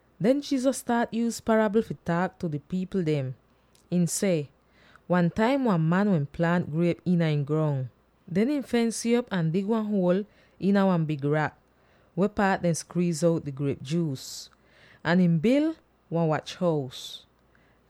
Den Jesus staat yuuz parabl fi taak tu di pipl dem. Ihn seh, “Wan taim wan man wehn plaant griep iina ihn grong. Den ihn fens'ih op ahn dig wan huol iina wan big rak, weh paat dehn skwiiz out di griep juus, ahn ihn bil wan wach-hous.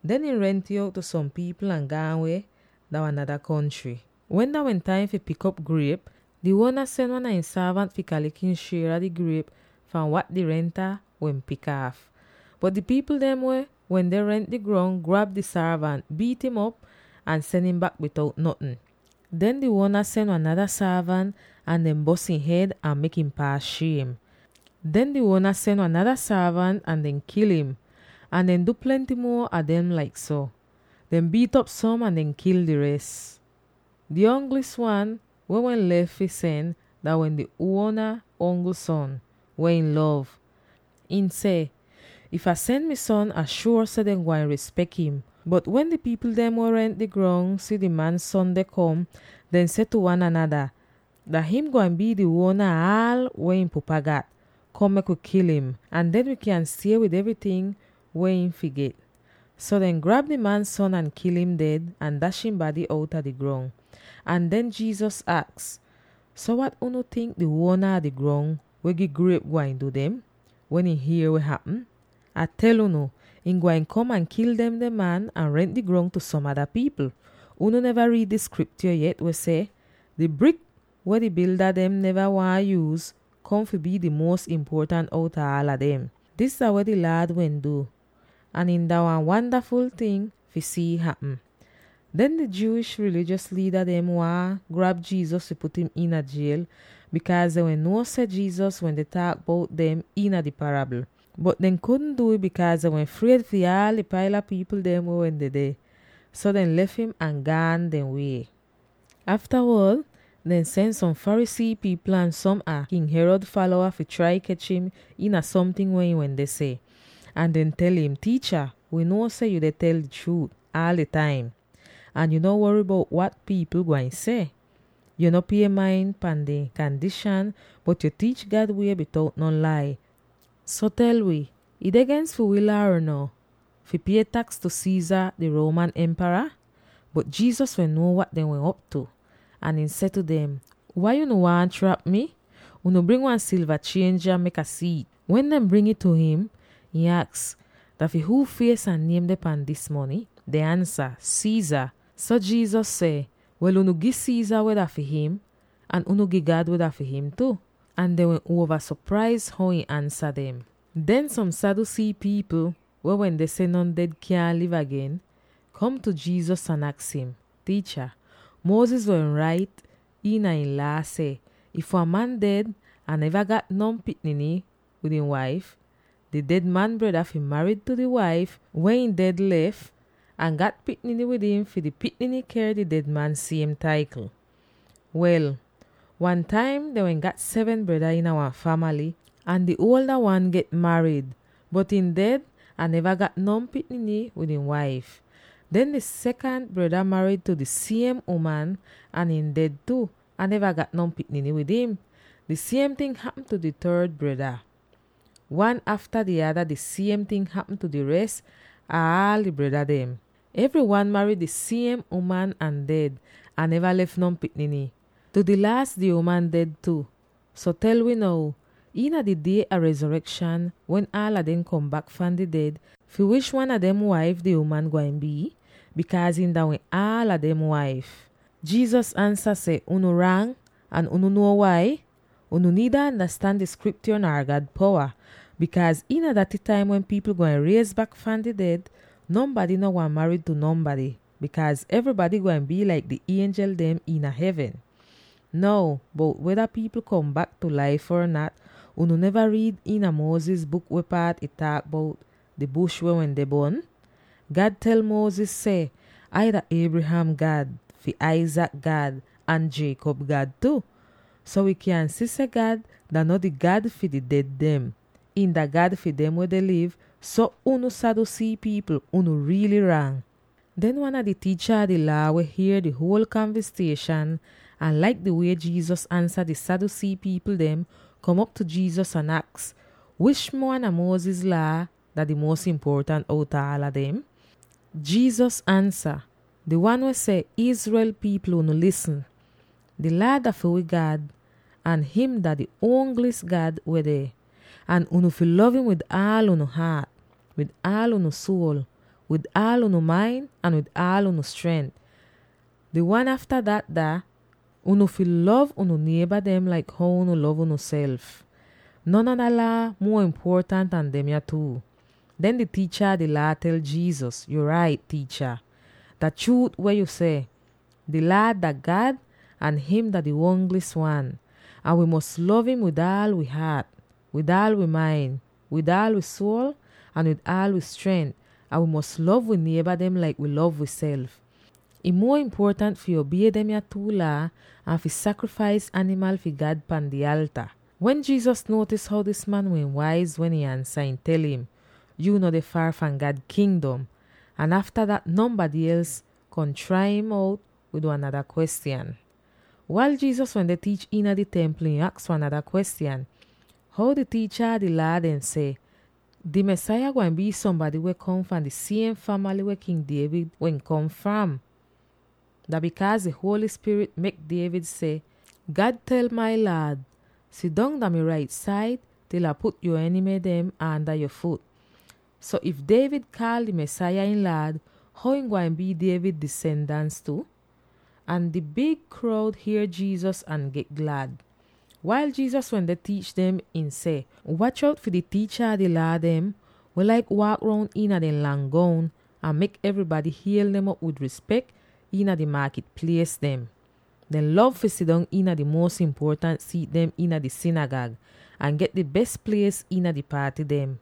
Den ihn rent'ih out tu som pipl ahn gaan weh dah wan nada kontry. Wen dah wehn taim fi pik griep, di uona sen wan a ihn sorvant fi kalek ihn shier a di griep fahn wat di renta wehn pik aaf. Bot di pipl dem weh wehn rent di grong, grab di sorvant, biit'im op, ahn sen im bak bitout notn. Den di uona sen wan nada sorvant, ahn dehn bos ihn hed ahn mek im paas shiem. Den di uona sen wan nada sorvant, ahn dehn kil im. Ahn dehn du plenty muo a dem laik so; dehn biit'op som ahn dehn kil di res. Di ongl wan weh wehn lef fi sen dah wehn di uona ongl son, weh ihn lov. Ihn seh, ‘If Ah sen mi son, Ah shuor seh dehn gwain rispek him.’ Bot wen di pipl dem weh rent di grong si di man son deh kom, dehn seh tu wan anada, ‘Dah him gwain bii di uona ah aal weh ihn pupa gat. Kom, mek wi kil im, ahn den wi kyan stie wid evryting weh him fi get!’ So dehn grab di man son ahn kil im ded, ahn dash ihn bady outa di grong.” Ahn den Jesus aks, “So, wat unu tink di uona a di grong weh gi griep gwain du dem, wen ihn hier weh hapm? Ah tel unu: ihn gwain kom ahn kil demde man ahn rent di grong tu som ada pipl. Unu neva riid di Skriptyo yet, weh seh: ‘Di brik weh di bilda dem neva waahn yuuz, kom fi bii di muos impuotant outa aala dem! Dis dah weh di Laad wehn du, ahn ih dah wan wandaful ting fi si'ih hapm!’” Den di Jewish rilijos liida dem waahn grab Jesus fi put im iina jiel, bikaaz dehn wehn nuo seh Jesus wende taak bout dem iina di parabl. Bot dehn kudn du'ih, bikaaz dehn wehn fried fi di paila pipl weh wehn dedeh. So, dehn lef im ahn gaan dehn wie. Aftawod dehn sen som Pharisee pipl ahn som a King Herod falowa fi trai kech im iina somting weh ihn wende seh. Ahn dehn tel im, “Tiicha, wi nuo seh yu tel di chruut aal di taim, ahn yu no wory bout wat pipl gwain seh. Yu no pie main pan dehn kandishan, bot yo tiich God wie bitout non lai. So tel wi: ih deh gens fi wi Laa or no, fi pie taks tu Caesar, di Roman Empara?” Bot Jesus wehn nuo wat dehn wehn op tu, ahn ihn seh tu dem, “Wai unu waahn trap mi? Unu bring wan silva chienj yah; mek Ah si'it.” Wen dehn bring ih tu him, ihn aks, “Dah fi huu fies ahn niem deh pahn dis mony?” Dehn ansa, “Caesar!” So Jesus seh, “Wel, unu gi Caesar weh dah fi him, ahn unu gi God weh dah fi him tu!” Ahn dehn wehn uova sopraiz how ihn ansa dem. Den som Sadducee pipl —weh wende seh non ded kyaahn liv agen— kom tu Jesus ahn aks im, “Tiicha, Moses wehn rait iina ihn Laa seh, ‘If wan man ded ahn neva gat non pikniny wid ihn waif, di ded man breda fi marid tu di waif weh ihn ded lef, ahn gat pikniny wid im fi di pikniny ker di ded man siem taikl.’ Wel, wan taim dehn wehn gat seven breda iina wan famaly, ahn di uolda wan get marid, bot ihn ded ahn neva gat non pikniny wid ihn waif. Den di sekant breda marid tu di siem uman ahn ihn ded tu, ahn neva gat non pikniny wid im. Di siem ting hapm tu di third breda. Wan afta di ada di siem ting hapm tu di res ah aal di breda dem. Evry wan marid di siem uman ahn ded, ahn neva lef non pikniny. Tu di laas, di uman ded tu. So tel wi now: iina di die a rezorekshan, wen aala dem kom bak fahn di ded, fi wish wan a dem waif di uman gwain bii, bikaaz ihn dah wehn aala dem waif?” Jesus ansa seh, “Unu rang, ahn unu nuo wai? Unu niida andastan di Skriptyo nar God powa. Bikaaz iina daty taim wen pipl gwain riez bak fahn di ded, nonbady no marid tu nonbady, bikaaz evrybady gwain bii laik di ienjel dem iina hevn. Now, bout weda pipl kom bak tu laif or nat, unu neva riid iina Moses buk weh paat ih taak bout di bush weh wende bon? God tel Moses seh, ‘Ai dah Abraham God, fi Isaac God, ahn Jacob God tu.’ So wi kyan si seh God dah no di God fi di ded dem; ihn dah God fi dem weh deh liv! So, unu Sadducee pipl, unu riily rang.” Den wan a di tiicha a di Laa, weh hier di huol kanvistieshan ahn laik di wie Jesus ansa di Sadducee pipl dem, kom op tu Jesus ahn aks, “Wish wan a Moses Laa dah di muos impuotant outa aala dem?” Jesus ansa, “Di wan weh seh, ‘Israel pipl, unu lisn! Di Laad dah fi wi God, ahn him dah di ongli'is God weh deh. Ahn unu fi lov im wid aal unu haat, wid aal unu suol, wid aal unu main, ahn wid aal unu strent.’ Di wan afta dat dah: ‘Unu fi lov unu nieba dem laik how unu lov unuself.’ Non ada Laa muo impuotant an demya two.” Den di tiicha a di Laa tel Jesus, “Yu rait, Tiicha, dah chruut weh yu seh. Di Laad dah God, ahn him dah di ongli'is wan. Ahn wi fi lov im wid aal wi haat, wid aal wi main, wid aal wi suol, ahn wid aal wi strent; ahn wi fi lov wi nieba dem laik wi lov wiself. Ih muo impuotant fi obie demya two Laa an fi sakrifais animal fi God pan di alta.” Wen Jesus nuotis how dis man wehn waiz wen ihn ansa, ihn tel im, “Yu no deh faar fahn God Kingdom.” Ahn afta dat nonbady els kom trai im out wid wan nada kwestyan. Wail Jesus wende tiich iina di Templ, ihn aks wan nada kwestyan, “How di tiicha a di Laa dem seh, ‘Di Mesaya gwain bii sombady weh kom fahn di siem famaly weh King David wehn kom fram?’ Dah bikaaz di Holy Spirit mek David seh, ‘God tel mai Laad: Sidong dah mi rait said, til Ah put yo enimy dem aanda yo fut.’ “So, if David kaal di Mesaya ihn Laad, how ihn gwain bii David disendans tu?” Ahn di big kroud hier Jesus ahn get glad. Wail Jesus wende tiich dem, ihn seh, “Wach out fi di tiicha a di Laa dem, weh laik waak roun iina dehn lang goun, ahn mek evrybady hiel dem op wid rispek iina di maakit plies dem. Dehn lov fi sidong iina di muos impuotant siit dem iina di sinigag, ahn get di bes plies iina di paaty dem.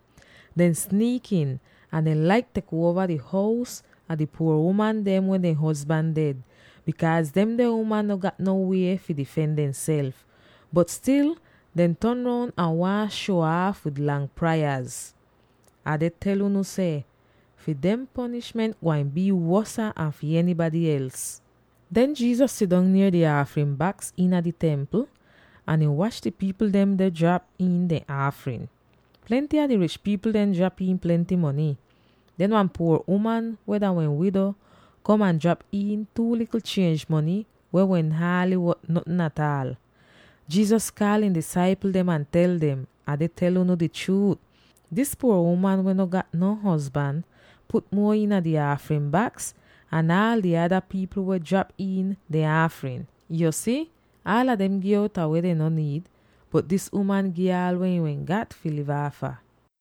Dehn sniikin, ahn dehn laik tek uova di hous a di puor uman dem weh dehn hozban ded, bikaaz demde uman no gat non wie fi difen demself. Bot stil dehn ton roun ahn waahn shuo aaf wid lang prayaz. Ah deh tel unu seh: Fi dehn ponishment gwain bii wosa an fi enybady els.” Den Jesus sidong nier di aafrin baks iina di Templ ahn ihn wach di pipl dem deh drap iin dehn aafrin. Plenty a di rich pipl dem drap iin plenty mony. Den wan puor uman weh dah wehn wido kom ahn drap iin two likl chienj mony, weh wehn haaly wot notn ataal. Jesus kaal ihn disaipl dem ahn tel dem, “Ah deh tel unu di chruut: dis puor uman weh no gat non hozban put muo iina di aafrin baks an aal di ada pipl weh drap iin dehn aafrin. Yo si, aala dem gi outa weh dehn no niid, bot dis uman gi aala weh ihn wehn gat fi liv aafa.”